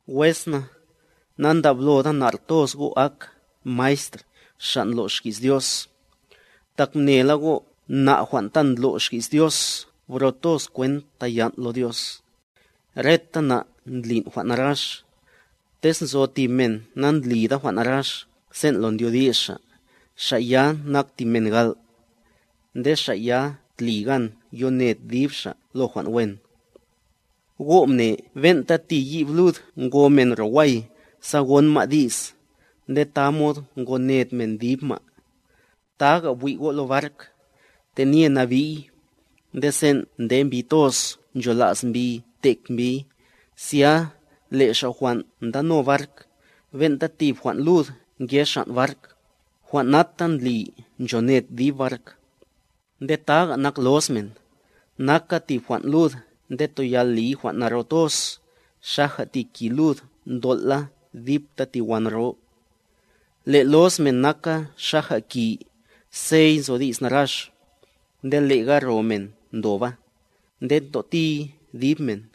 Wes na, nandabloda nar toz go' ak maestr xa' ndlo' xki's Dios, tak mnela go' na' jwan' ta ndlo' xki's Dios bro toz kwent tayan' lo Dios. Reta na' ndli jwan' narax. Tez nzo tib men nandlida jwan' narax sen' lo ndyodi's xa', xa' ya nak tib men gal', nde xa' ya tli gan yoned dib xa' lo jwan' wen. Go' mne ben'ta ti yib lud ngo men ro way sa gon ma' di's, nde tamod ngoned men dib ma'. Taga bwi' go' lo bark; tenye nabi'y, nde sen' nde mbi toz nchola's mbi tek mbiy, zya le' xa' jwan' ndano bark, ben'ta tib jwan' lud nge xan' bark,a jwan' nata ndli nchoned dib bark. Nde taga nak loz men, naka tib jwan' lud nde toyal liy jwan' naro toz, xaja tib ki lud ntol' la dipta ti wan ro. Le' loz men naka xaja ki, sey nzo di's narax, nde lega ro men ndoba, nde ntotiy dib men.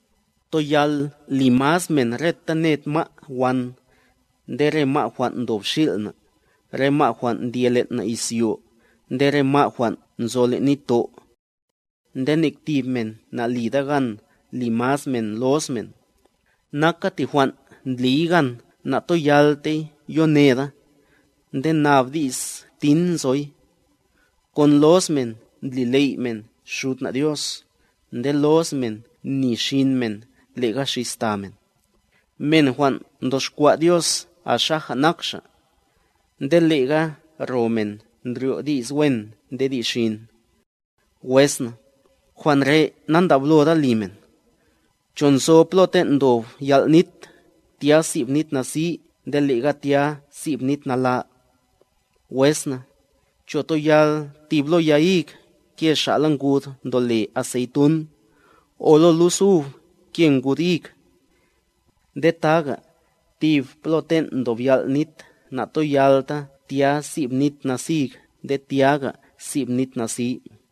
Toyal li maz men reta ned ma' wan, nde re ma' jwan' ndob xil' na, re ma' jwan' ndye len' na izyo, nde re ma' jwan' nzo len' nitto'. Nde nek tib men nalida gan li maz men loz men, naka ti jwan' ndliy gan natoyaltey yoneda, nde nab di's tin nzoy. Kon loz men ndli ley' men Xud na' Dios, nde loz men ni xin men lega xis ta men, men jwan' mtoxkwa' Dios a xaja nak Xa'. Nde lega ro men ndryo' di's wen nde di's xin. Wes na, jwan' re' nandabloda li men. ¿Cho nzo plo ten' ndob yal' nit, tya sib nit nasi nde lega tya sib nit nala? Wes na, ¿cho toyal tib lo ya hig ke xa'la ngud ndole aseytun, o lo lus ub ke ngud hig? Nde taga, tib plo ten' ndob yal' nit na'toyalta tya sib nit nasig nde tyaga sib nit nasi.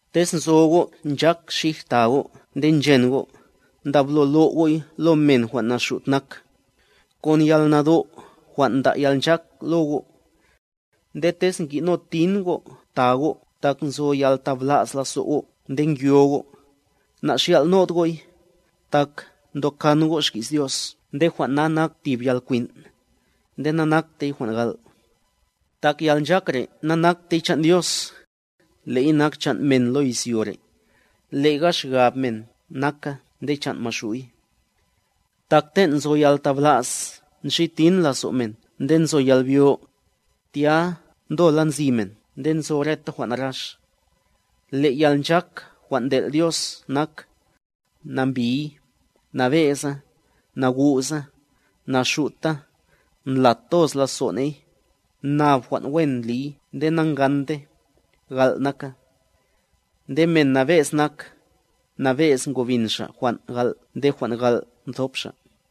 Tez nzo go' nchak xij ta go' nde nchen go', ndablo lo' go'y lo men jwan' naxut nak, kon yalnado' jwan' nda' yalnchak lo go'. Nde tez ngi'no tin go' ta go' tak nzo yaltabla's lazo' go' nde ngyo go', naxyal'nod go'y, tak ntokan go' xki's Dios nde jwan' na nak tib yalkwin', nde nanaktey jwan' gal'. Tak yalnchak re' nanaktey chan' Dios, le'y nak chan' men lo izyo re', lega xgab men naka nde chan' Maxu'y. Tak ten' nzo yaltabla's nxi tin lazo' men nde nzo yalbyo, tya ndola nzi men nde nzo reta jwan' narax. Le' yalnchak jwan' ntel' Dios nak: Nambiy, nabe'za, nagu'za, naxuta, ndlat toz lazo' ney, nab jwan' wen ndliy nde nangante, gal' naka. Nde men nabe'z nak, nabe'z ngobin xa' jwan' gal' nde jwan' gal' thop xa'.